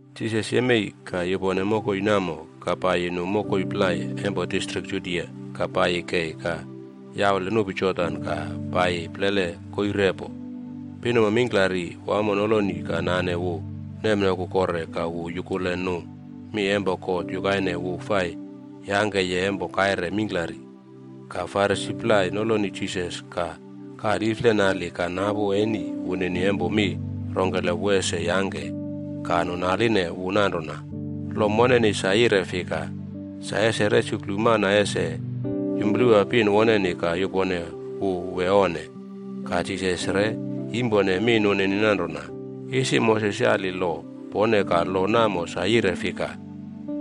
Jisas yemei ka yupone mokoi namo ka paiyi nu mokoi plai empo distrik Judia ka paiyi kei ka yaule nupi Jordan ka paiyi plele koii repo. Pinuma mingklari wamo noloni ka nane wu nemnoku kore ka wu yukule nu mi empo God yukaine wu fai yangkeye empo kaire mingklari. Ka Farisi plai noloni Jisas ka kaliflenali ka napu eni wunini empo mi rongkele wu ese yangke. Ka nu naline wu nanrona, “Lo moneni sa yire fika, sa ese resuklu mana ese yumplewa pin woneni ka yupone wu wee onne?” Ka Jisas re yimpone mi nunini nanrona, “Isi Moses yali lo pone ka lo namo sa yire fika?”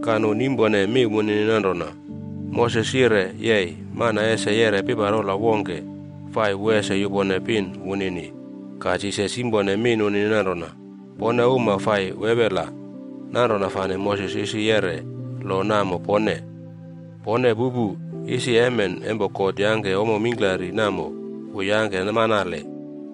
Ka nu nimpone mi wunini nanrona, “Moses yire yei mana ese yeꞌre piparola wongke fai wu ese yupone pin wunini.” Ka Jisas yimpone mi nunini nanrona, “Pone uma fai wewela, nanrona fane Moses isi yeꞌre lo namo pone. Pone pupu, isi emen empo God yangke ommo mingklari namo, wu yangke manale.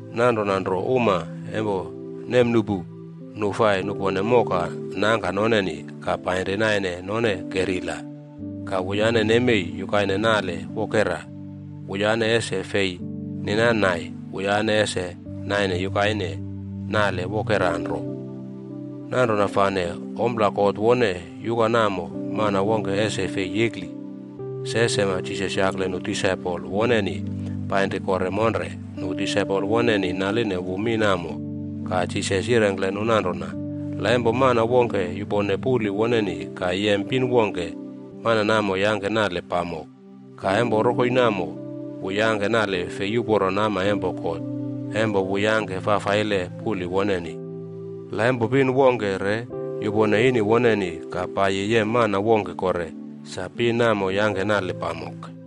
‘Nanrona nro uma empo nemnuꞌpu, nu fai nupone moka nangka noneni ka painri naine none kerila, ka wuyane nemei yukaine nale wokera.’b Wuyane ese fei ninan nai, wuyane ese naine yukaine nale wokera nro. Nanrona fane ompla God wone yuka namo, mana wongke ese fei yekli.” Se sema Jisas yakle nu disaipol woneni painri kore monre, nu disaipol woneni naline wu mi namo. Ka Jisas yirengkle nu nanrona, “La empo mana wongke yupone puli woneni ka yem pin wongke, mana namo yangke nale pamok. Ka empo rokoi namo, wu yangke nale fei uporo nama empo God empo wu yangke fafaile puli woneni. La empo pin wongke re yupone ini woneni ka paiyi yem mana wongke kore, sa pin namo yangke nale pamok.”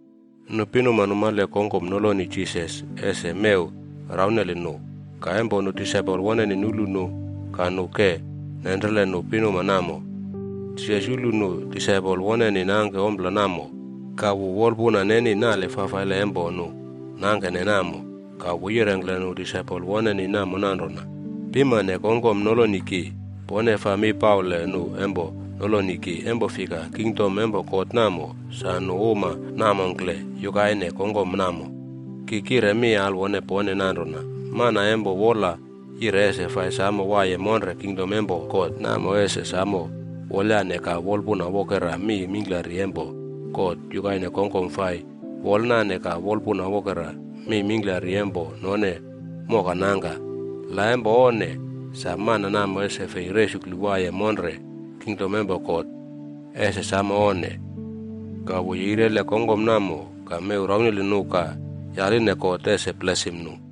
Nu pinuma numale kongkom noloni Jisas ese mew rauneli nu. Ka empo nu disaipol woneni nulu nu ka nu ke nenrele nu pinuma namo. Jisas yulu nu disaipol woneni nangke ompla namo ka wu wolpuna neni nale fafaile empo nu nangkene namo. Ka wu yirengkle nu disaipol woneni namo nanrona, “Pimane kongkom noloni ki. Pone faa mi paule nu empo noloni ki. Empo fika, kingdom empo God namo, sa nu uma namongkle yukaine kongkom namo. Ki kire mi alwone pone nanrona, mana empo wola yire ese fai samo waiye monre kingdom empo God namo, ese samo wolyane ka wolpuna wokera mi mingklari empo God yukaine kongkom fai wolnane ka wolpuna wokera mi mingklari empo none moka nangka. La empo onne sa, mana namo ese fei resuklu waiye monre kingdom empo God. Ese samo onne!” Ka wu yeirele kongkom namo ka mew rauneli nu ka yaline God ese blesim nu.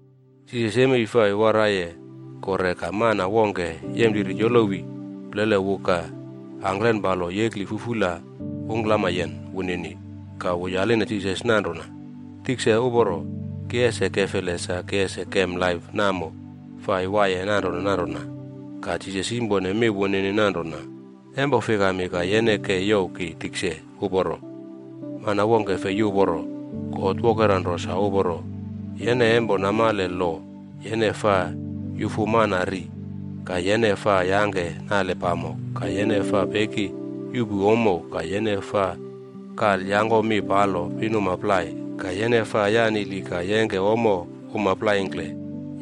Jisas yemei fai waraiye kore ka mana wongke yempliri yolowi plele wu ka angklen palo yekli fufula ungklamayen wunini. Ka wu yaline Jisas nanrona, “Tikse uporo, ki ese kefele sa ki ese kem laip namo fai waiye nanrona nanrona?” Ka Jisas yimpone mi wunini nanrona, “Empo fikami ka yene ke youw ki tikse uporo? Mana wongke fei uporo. God wokera nro sa uporo. Yene empo namale lo: ‘Yene faa yufu mana ri, ka yene faa yangke nale pamok, ka yene faa peki yuꞌpu ommo, ka yene faa kalyangkomi palo pinuma plai, ka yene faa yanili ka yengke ommo uma plaingkle,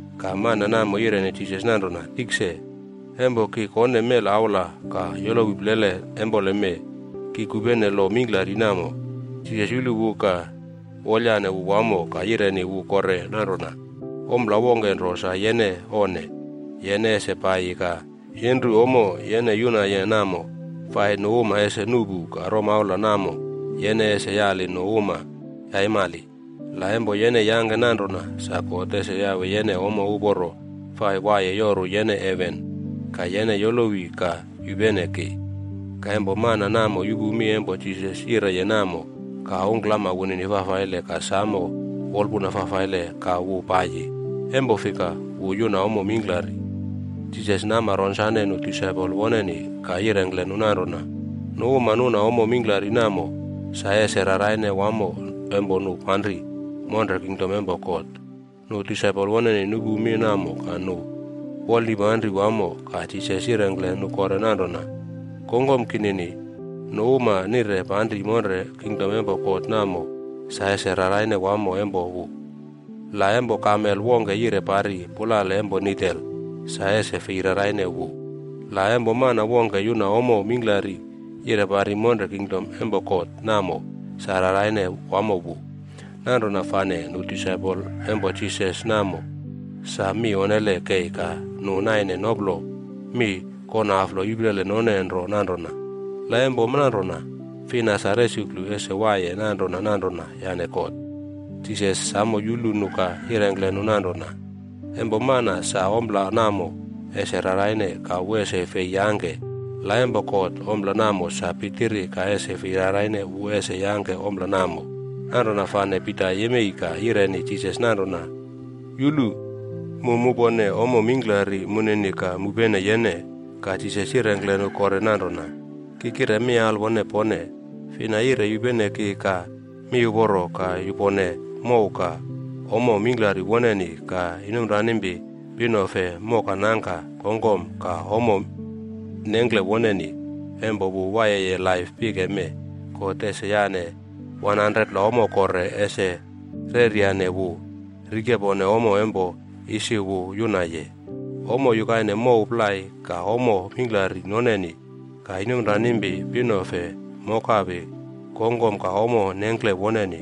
Ka mana namo yireni Jisas nanrona, “Tikse, empo ki kone mela aula ka yolowi plele empoleme, ki kupene lo mingklari namo.” Jisas yulu wu ka wolayane wu wamo ka yireni wu kore nanrona, “Ompla wongke nro sa yene onne. Yene ese paiyi ka yenru ommo yene yunaye namo fai nu uma ese nuꞌpu ka romaula namo yene ese yali nu uma yaimali. La empo yene yangke nanrona, sa God ese yawe yene ommo uporo fai waiye yoru yene heven. Ka yene yolowi ka yupene ki.” Ka empo mana namo yupu mi empo Jisas yireye namo ka ungklama wunini fafaile ka samo wolpuna fafaile ka wu paiyi. Empo fika, wu yuna ommo mingklari. Jisas nama ronsane nu disaipol woneni ka yirengkle nu nanrona, “Nu uma nuna ommo mingklari namo, sa ese raraine wamo empo nu panri monre kingdom empo God.” Nu disaipol woneni nupu mi namo ka nu wolnipanri wamo. Ka Jisas yirengkle nu kore nanrona, “Kongkom kinini, nu uma nire panri monre kingdom empo God namo sa ese raraine wamo empo wu. La empo kamel wongke yire pari pulale empo nidel, sa ese fei raraine wu. La, empo mana wongke yuna ommo mingklari yire pari monre kingdom empo God, namo sa raraine wamo wu.” Nanrona fane nu disaipol empo Jisas namo sa mi onnele kei ka nu naine noplo mi konaflo iplele none nro nanrona, “La empo nanrona fina sa resuklu ese waiye nanrona nanrona yane God?” Jisas samo yulu nu ka yirengkle nu nanrona, “Empo mana, sa ompla namo ese raraine ka wu ese fei yangke, la empo God ompla namo sa pitiri ka ese fei raraine wu ese yangke ompla namo.” Nanrona fane Pita yemei ka yireni Jisas nanrona, “Yulu! Mu mupone ommo mingklari munini ka mupene yene!” Ka Jisas yirengkle nu kore nanrona, “Ki kire mi alwone pone, fina yire yupene ki ka miuporo, ka yupone mow, ka ommo mingklari woneni, ka inomranimpi, pinofe, moka, nangka, kongkom, ka ommo nengkle woneni, empo wu waiyeye laip pike mee, God ese yane 100pla ommo kore ese reryane wu, rikepone ommo empo isi wu yunaye: Ommo yukaine mow plai, ka ommo mingklari noneni, ka inomranimpi, pinofe, mokapi, kongkom, ka ommo nengkle woneni.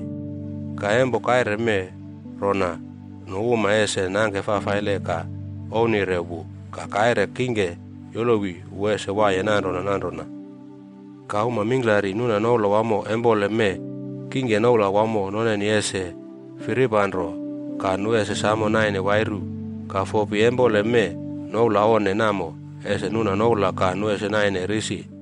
Ka empo kaire mee rona nu uma ese nangke fafaile ka ouwnire wu. Ka kaire kingke yolowi wu ese waiye nanrona nanrona. Ka uma mingklari nuna noula wamo empole mee, kingke noula wamo noneni ese firipanro ka nu ese samo naine wairu. Ka fopi empole mee noula onne namo, ese nuna noula ka nu ese naine risi.”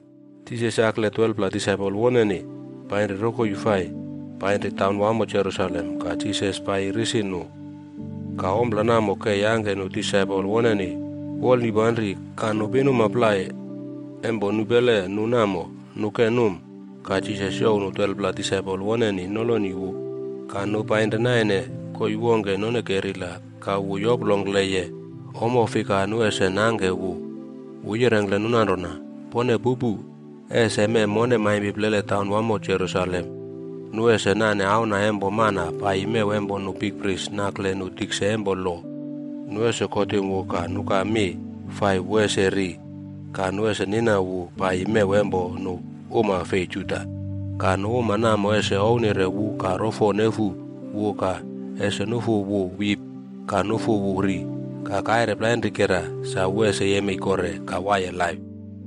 Jisas yakle 12pla disaipol woneni painri rokoi fai painri taunwamo Jerusalem ka Jisas paiyi risi nu. Ka ompla namo ke yangke nu disaipol woneni wolnipanri, ka nu pinuma plai empo nupele nu namo, nu ke num. Ka Jisas youw nu 12pla disaipol woneni noloni wu ka nu painri naine koii wongke nonkerila ka wu yoplongkleye ommo fika nu uma ese nangke wu. Wu yirengkle nu nanrona, “Pone pupu. Ese mee mone maimpi plele taunwamo Jerusalem, nu ese nane Auna empo Mana paiyi mew empo nu bikpris nakle nu tikse empo lo. Nu ese kotim wu ka nuka mi fai wu ese ri. Ka nu ese nina wu paiyi mew empo nu uma fei Juda. Ka nu uma namo ese ouwnire wu ka rofo nefu wu ka ese nufu wu wip ka nufu wu ri. Ka kaire plainrikera sa wu ese yemei kore ka waiye laip.”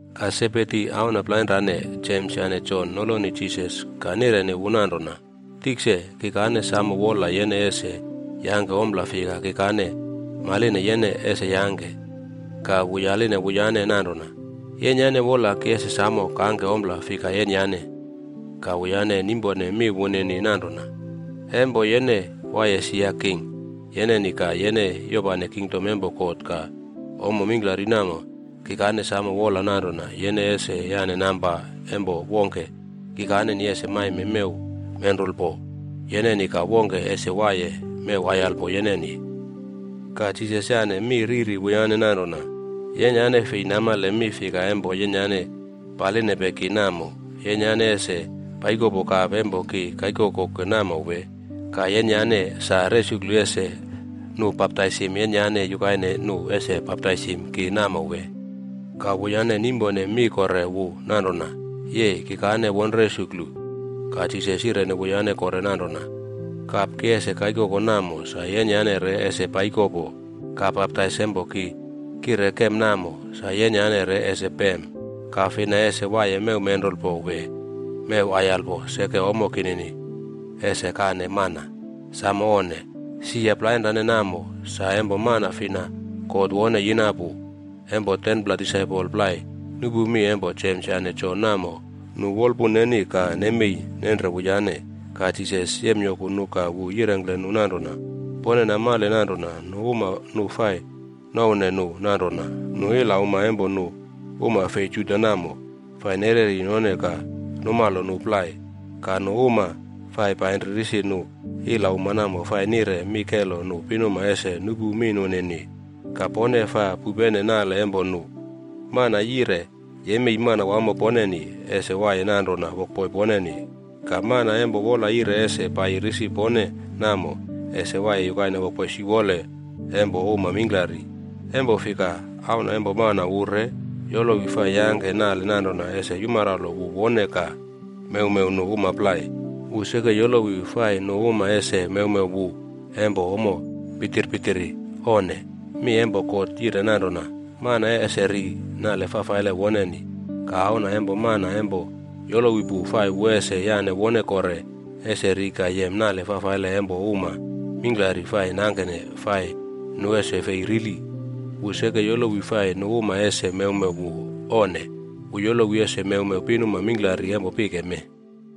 Ka Sebedi auna plainrane, Jems yane Jon noloni Jisas ka nireni wu nanrona, “Tikse, kikane samo wola yene ese yangke ompla fika kikane maline yene ese yangke.” Ka wu yaline wuyane nanrona, “Yenyane wola ki ese samo kangke ompla fika yenyane?” Ka wuyane nimpone mi wunini nanrona, “Empo yene waiye sia king yeneni ka yene yopane kingdom empo God ka ommo mingklari namo, kikane samo wola nanrona yene ese yane namba empo wongke kikane ese maime mew menrulpod yeneni ka wongke ese waiye mew aiyalpo yeneni.” Ka Jisas yane mi riri wuyane nanrona, “Yenyane fei namale mi fika empo yenyane palinepe ki namo. Yenyane ese paikopo kap empo ki kaikokoke namo, wee? Ka yenyane sa resuklu ese nu baptaisim yenyane yukaine nu ese baptaisim ki namo wee?” Ka wuyane nimpone mi kore wu nanrona, “Yei, kikane won resuklu.” Ka Jisas yireni wuyane kore nanrona, “Kap ki ese kaikoko namo sa yenyane re ese paikopo. Ka baptais empo ki kire kem namo, sa yenyane re ese pem. Ka fina ese waiye mew menrulpo wee mew aiyalpo seke ommo kinini ese kane mana. Samo onne! Sia plainrane namo sa empo mana fina God wone yina pu.” Empo 10pla disaipol plai nupu mi empo Jems yane Jon namo, nu wolpun neni ka nemei nenre wuyane. Ka Jisas yemyoku nu ka wu yirengkle nu nanrona, “Pone namale nanrona nu uma nu fai nouwne nu nanrona nu ilauma empo nu uma fei Juda namo, fai nereri none ka numalo nu plai. Ka nu uma fai painri risi nu ilauma namo fai nire mi kelo nu pinuma ese nupu mi nunini. Ka pone faa pupene nale empo nu. Mana yire yemei manawamo poneni, ese waiye nanrona wokboi poneni. Ka mana empo wola yire ese paiyi risi pone namo, ese waiye yukaine wokboi siwole empo uma mingklari. Empo fika, Auna Empo Mana wu re yolowi fai yangke nale nanrona ese yumaralo wu wone ka mewmew nu uma plai. Wu seke yolowi fai nu uma ese mewmew wu empo ommo pitir pitiri. Onne! Mi empo God yire nanrona, mana ese ri nale fafaile woneni. Ka Auna empo Mana empo yolowi pu fai wu ese yane wone kore ese ri ka yem nale fafaile empo uma mingklari fai nangkene fai nu ese fei rili. Wu seke yolowi fai nu uma ese mewmew wu. Onne! Wu yolowi ese mewmew pinuma mingklari empo pike mee.”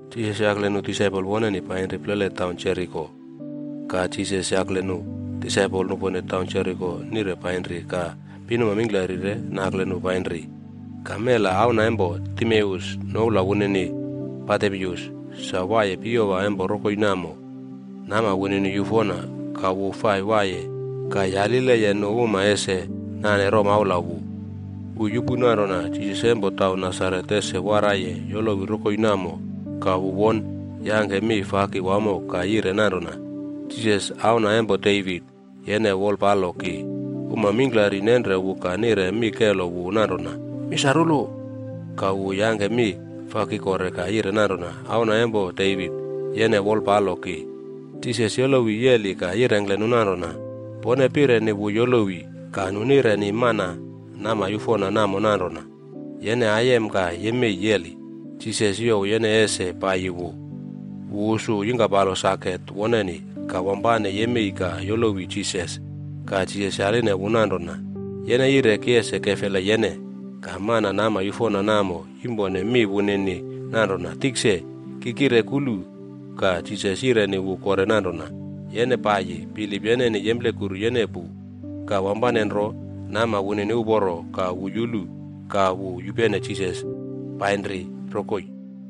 Jisas yakle nu disaipol woneni painri plele taun Jeriko. Ka Jisas yakle nu disaipol nupone taun Jeriko nire painri ka pinuma mingklari re nakle nu painri. Ka mela auna empo Timeus, noula wunini Bartimeus, sa waiye piyowa empo rokoi namo. Nama wunini yufona. Ka wu fai waiye ka yalileye nu uma ese nane romaula wu. Wu yupu nanrona Jisas empo taun Nasaret ese waraiye yolowi rokoi namo ka wu won yangke mi faki wamo ka yire nanrona, “Jisas, Auna empo Devit, yene wolpalo ki!” Uma mingklari nenre wu ka nire mi kelo wu nanrona, “Misarulu!” Ka wu yangke mi faki kore ka yire nanrona, “Auna empo Devit, yene wolpalo ki!” Jisas yolowi yeli ka yirengkle nu nanrona, “Pone pireni wu yolowi.” Ka nu nireni mana nama yufona namo nanrona, “Yene aiyem ka yemei yeli, Jisas youw yene ese paiyi wu.” Wu usu yingkapalo saket woneni ka wampane yemei ka yolowi Jisas. Ka Jisas yaline wu nanrona, “Yene yire ki ese kefele yene?” Ka mana nama yufona namo yimpone mi wunini nanrona, “Tikse, ki kire kulu.” Ka Jisas yireni wu kore nanrona, “Yene paiyi. Bilip yeneni yemplekuru yene pu.” Ka wampane nro, nama wunini uporo ka wu yulu. Ka wu yupene Jisas painri rokoi.